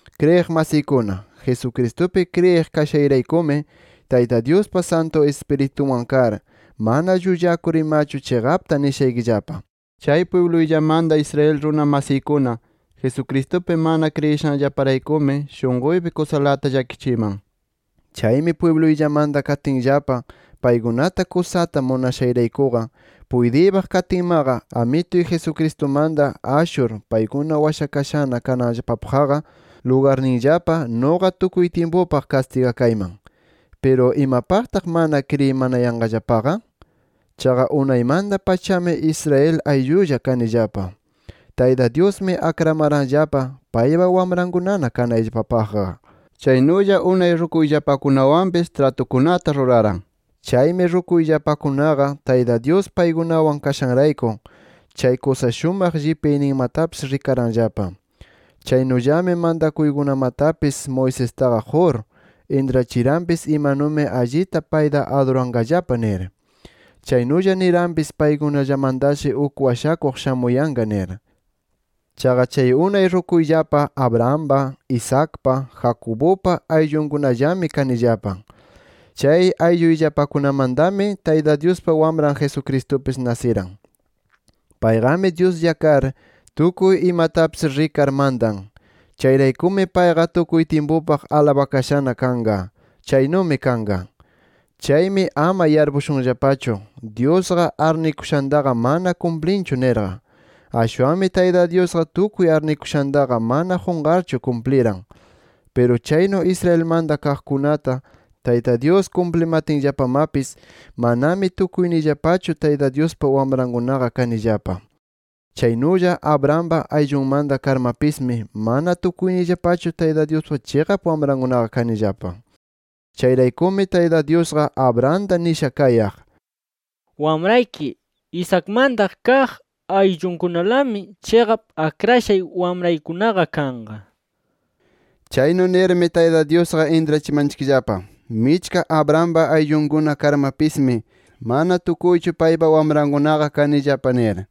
Kriyiq masiykuna, Jesucristupi kriyiq kashayraykumi, Tayta Dyuspa Santu Ispirituwan kar, mana llullakur imachu chiqapta nishaykillapa: Chay pwibluyllamanta Israel runa masiykuna, Jesucristupi mana kriyishanllaparaykumi shunquypi kusalata llakichiman. Chaymi pwibluyllamanta katinllapa paykunata kusata munashayraykuqa, puytiypaq katinmaqa Amituy Jesucristumanta ashur paykuna washakashana kananllapapaqqa lugarninllapa nuqa tukuy tyimpupaq kastigakayman. ¿Piru imapaqtaq mana kriyinayanqallapaqa? Chaqa unaymanta-pachami Israel ayllulla kanillapa. Tayta Dyusmi akramaranllapa, paypa wamrankuna kanayllapapaqqa. Chaynulla unay rukuyllapakunawanpis tratukunata ruraran. Chaymi rukuyllapakunaqa Tayta Dyus paykunawan kashanrayku chay kusa shumaq llipyayninmatapis rikaranllapa. Chaynullami mantakuykunamatapis Moisestaqa qur, intrachiranpis, imanumi allita payta aduranqallapa nir. Chaynulla niranpis, paykunallamantashi uk washakuq shamuyanqa nir. Chaqa chay unay rukuyllapa Abrahampa, Isaacpa, Jacobupa ayllunkunallami kanillapa. Chay aylluyllapakunamantami Tayta Dyuspa Wamran Jesucristupis nasiran. Payqami Dyuslla kar, tukuy imatapis rikar mantan. Chayraykumi payqa tukuy tyimpupaq alabakashana kanqa. ¡Chaynumi kanqa! Chaymi ama yarpushunllapachu, Dyusqa arnikushantaqa mana kumplinchu nirqa. Ashwanmi Tayta Dyusqa tukuy arnikushantaqa mana qunqarchu kumpliran. Piru chaynu Israelmanta kaqkunata Tayta Dyus kumplimatinllamapis, manami tukuyniyllapachu Tayta Dyuspa wamrankunaqa kanillapa. Chaynulla Abrahampa ayllunllamanta karmapismi, mana tukuyniyllapachu Tayta Dyuspa chiqap wamrankunaqa kanillapa. Chayraykumi Tayta Dyusqa Abrahamta nisha kayaq: “Wamrayki Isaacmanta kaq ayllunkunalami, chiqap akrashay wamraykunaqa kanqa” nir. Chaynu nirmi, Tayta Dyusqa intrachimanchikllapa, michka Abrahampa ayllunkuna karmapismi, mana tukuychu paypa wamrankunaqa kanillapa nir.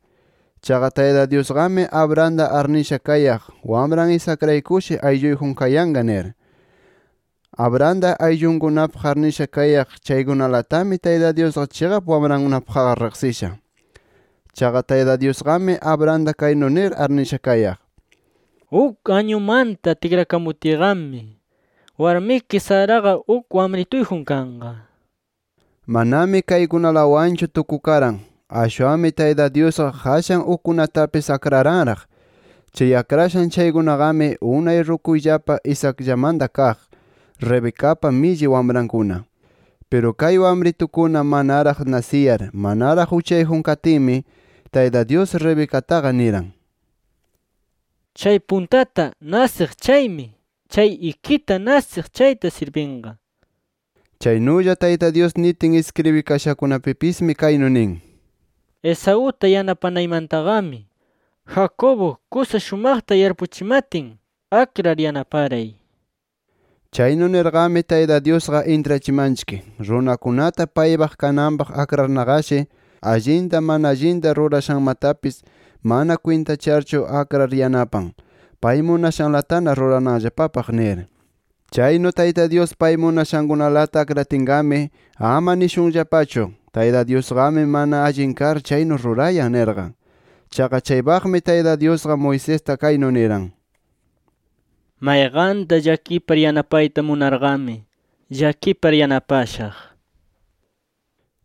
Chaqa Tayta Dyusqami Abrahamta arnisha kayaq wamran Isaacraykushi aylluyjun kayanqa nir. Abrahamta ayllunkunapaq arnisha kayaq chaykunalatami Tayta Dyusqa chiqap wamrankunapaqqa riqsisha. Chaqa Tayta Dyusqami Abrahamta kaynu nir arnisha kayaq: “Uk añumanta tikrakamutiyqami, warmiki Saraqa uk wamrituyjun kanqa” nir. Manami kaykunalawanchu tukukaran. Ashwanmi Tayta Dyusqa qashan ukkunatapis akraranraq. Chay akrashan chaykunaqami unay rukuyllapa Isaacllamanta kaq, Rebecapa milli wamrankuna. Piru kay wamritukuna manaraq nasiyar manaraq uchayjun katinmi Tayta Dyus, Rebecataqa niran: “Chay puntata nasiq chaymi, chay ikita nasiq chayta sirbinqa” nir. Chaynulla Tayta Dyus nitin iskribikashankunapipismi kaynu nin: “Esauta yanapanaymantaqami, Jacobo kusa shumaqta yarpuchimatin akrar yanaparay” nir. Chaynu nirqami Tayta Dyusqa intrachimanchik, runakunata paypaq kananpaq akranarqashi, allinta mana allinta rurashanmatapis mana kwintacharchu akrar yanapan, pay munashanlatana rurananllapapaq nir. Chaynu Tayta Dyus pay munashankunalata akratinqami, ama nishunllapachu: “Tayta Dyusqami mana allin kar chaynu rurayan” nirqa. Chaqa chaypaqmi Tayta Dyusqa, Moisesta kaynu niran: “Mayqanta llakipar yanapayta munarqami, llakipar yanapashaq” nir.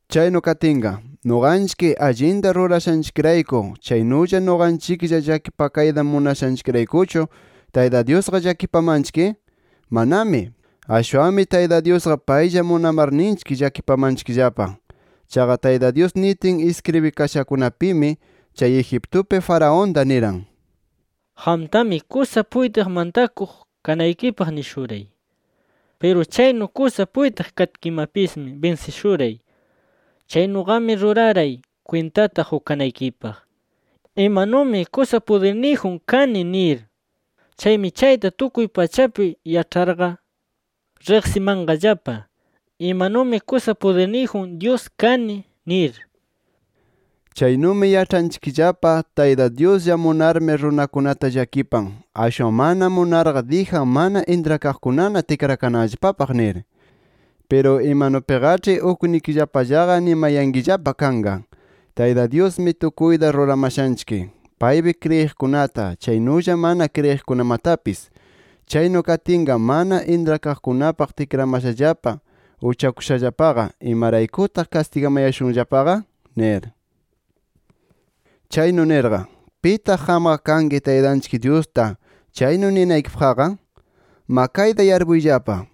Chaynu katinqa ¿nuqanchik allinta rurashanchikrayku chaynulla nuqanchiklla llakipakayta munashanchikraykuchu Tayta Dyusqa llakipamanchik? ¡Manami! Ashwanmi Tayta Dyusqa paylla munamarninchik llakipamanchikllapa. Chaqa Tayta Dyus nitin iskribikashakunapimi, chay Egiptupi Faraonta niran: “Qamtami kusa puytiq mantakuq kanaykipaq nishuray. Piru chaynu kusa puytiq katkimapismi binsishuray. Chaynuqami ruraray kwintata qukanaykipaq, imanumi kusa pudirniyjun kani nir. Chaymi chayta tukuy pachapi yaĉharqa, riqsimanqallapa imanumi kusa pudirniyjun Dyus kani” nir. Chaynumi yaĉhanchikllapa Tayta Dyuslla munarmi runakunata llakipan, ashwan mana munarqa dijan mana intrakaqkunana tikrakananllapapaq nir. Piru imanupiqaĉhi uknikillapallaqa nimayankillapa kanqa. “Tayta Dyusmi tukuyta ruramashanchik, paypi kriyiqkunata, chaynulla mana kriyiqkunamatapis. Chaynu katinqa mana intrakaqkunapaq tikramashallapa uchakushallapaqa ¿imaraykutaq kastigamayashunllapaqa?” nir. Chaynu nirqa, ¿pitaq qamqa kanki Taytanchik Dyusta chaynu ninaykipaqqa? Ma kayta yarpuyllapa,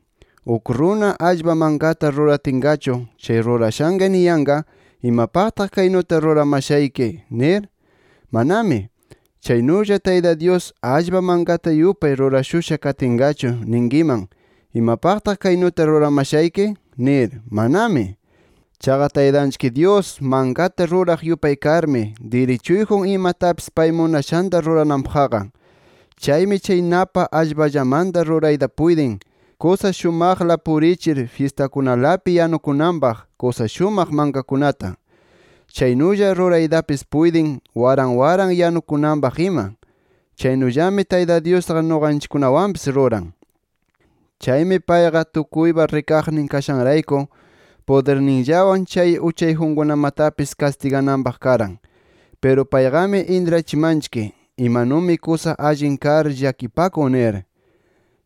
¿uk runa, allpa mankata ruratinqachu, chay rurashanqa niyanqa, imapaqtaq kaynuta ruramashayki? nir. ¡Manami! Chaynulla, Tayta Dyus, allpa mankata yupay rurashusha katinqachu ninkiman, ¿imapaqtaq kaynuta ruramashayki? nir. ¡Manami! Chaqa Taytanchik Dyus mankata ruraq yupay karmi, dirichuyjun imatapis pay munashanta rurananpaqqa. Chaymi chay napa allpallamanta rurayta puytin, kusa shumaqla purichir fyistakunalapi yanukunanpaq kusa shumaq mankakunata. Chaynulla ruraytapis puytin, waran waran yanukunanpaq ima. Chaynullami Tayta Dyusqa nuqanchikkunawanpis ruran. Chaymi payqa tukuypa rikaqnin kashanrayku, pudirninllawan chay uchayjunkunamatapis kastigananpaq karan. Piru payqami intrachimanchik, imanumi kusa allin kar llakipakun nir.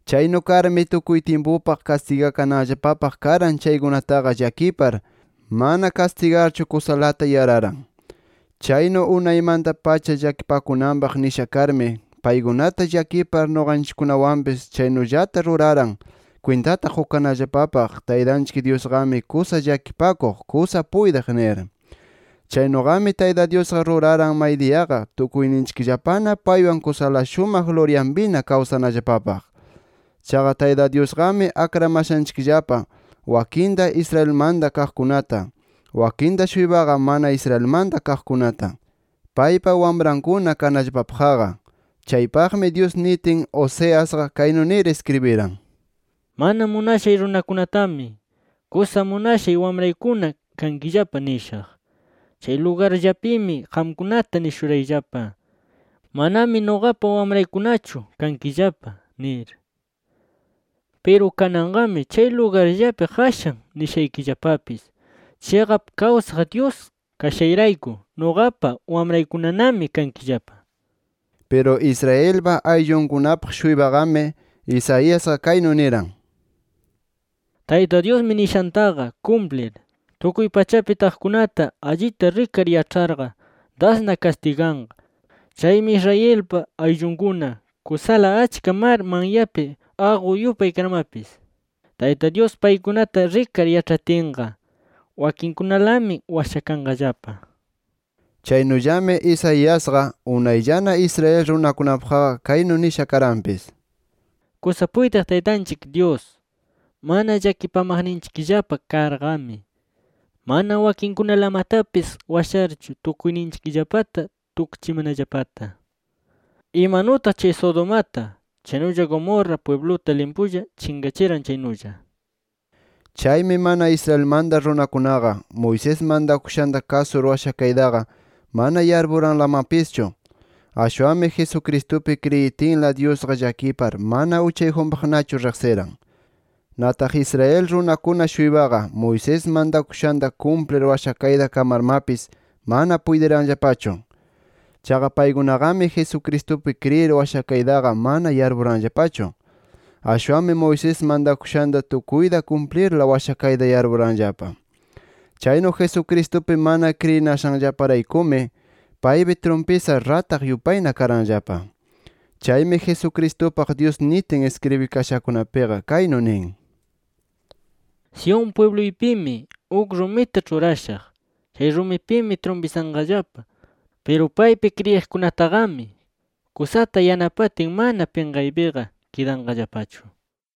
Chaynu karmi, tukuy tyimpupaq kastigakananllapapaq karan chaykunataqa llakipar, mana kastigarchu kusalata yararan. Chaynu unaymanta-pacha llakipakunanpaq nisha karmi, paykunata llakipar nuqanchikkunawanpis chaynullata ruraran kwintata qukanallapapaq Taytanchik Dyusqami kusa llakipakuq, kusa puytiq nir. Chaynuqami Tayta Dyusqa ruraran, maydiyaqa tukuyninchikllapana paywan kusala shumaq luryanpina kawsanallapapaq. Chaqa Tayta Dyusqami akramashanchikllapa wakinta Israelmanta kaqkunata, wakinta-shuypaqa mana Israelmanta kaqkunata, paypa wamrankuna kanallapapaqqa. Chaypaqmi Dyus nitin, Oseasqa kaynu nir iskribiran: “Mana munashay runakunatami, kusa munashay wamraykuna kankillapa nishaq. Chay lugarllapimi qamkunata nishurayllapa: ‘Manami nuqapa wamraykunachu kankillapa’ nir. Piru kananqami chay lugarllapi qashan nishaykillapapis: ‘Chiqap kawsaq Dyus kashayrayku nuqapa wamraykunanami kankillapa’ nir”. Piru Israelpa ayllunkunapaq-shuypaqami, Isaiasqa kaynu niran: “Tayta Dyusmi nishantaqa kumplir, tukuy pachapi taqkunata allita rikar yaĉharqa dasna kastiganqa. Chaymi Israelpa ayllunkuna kusala achka mar manyapi aqu yupay karmapis, Tayta Dyus paykunata rikar yaĉhatinqa, wakinkunalami washakanqallapa” nir. Chaynullami Isaiasqa, unayllana Israel runakunapaqqa kaynu nisha karanpis: “Kusa puytiq Taytanchik Dyus mana llakipamaqninchikllapa karqami, mana wakinkunalamatapis washarchu tukuyninchikllapata tukchimanallapata, imanutaq chay Sodomata, chaynulla Gomorra pwibluta limpulla chinqachiran chaynulla” nir. Chaymi mana Israelmanta runakunaqa Moisés mantakushanta kasur washakaytaqa mana yarpuranlamapischu. Ashwanmi Jesucristupi kriyitinla Dyusqa llakipar mana uchayjunpaqnachu riqsiran. Nataq Israel runakuna-shuypaqa, Moisés mantakushanta kumplir washakayta kamarmapis mana puytiranllapachu. Chaqa paykunaqami Jesucristupi kriyir washakaytaqa mana yarpuranllapachu. Ashwanmi Moisés mantakushanta tukuyta kumplirla washakayta yarpuranllapa. Chaynu Jesucristupi mana kriyinashanllaparaykumi, paypi trumpisar rataq yupayna karanllapa. Chaymi Jesucristupaq Dyus nitin iskribikashakunapiqa, kaynu nin: “Sión pwibluypimi uk rumita ĉhurashaq. Chay rumipimi trumpisanqallapa. Piru paypi kriyiqkunataqami kusata yanapatin, mana pinqaypiqa kidanqallapachu” nir.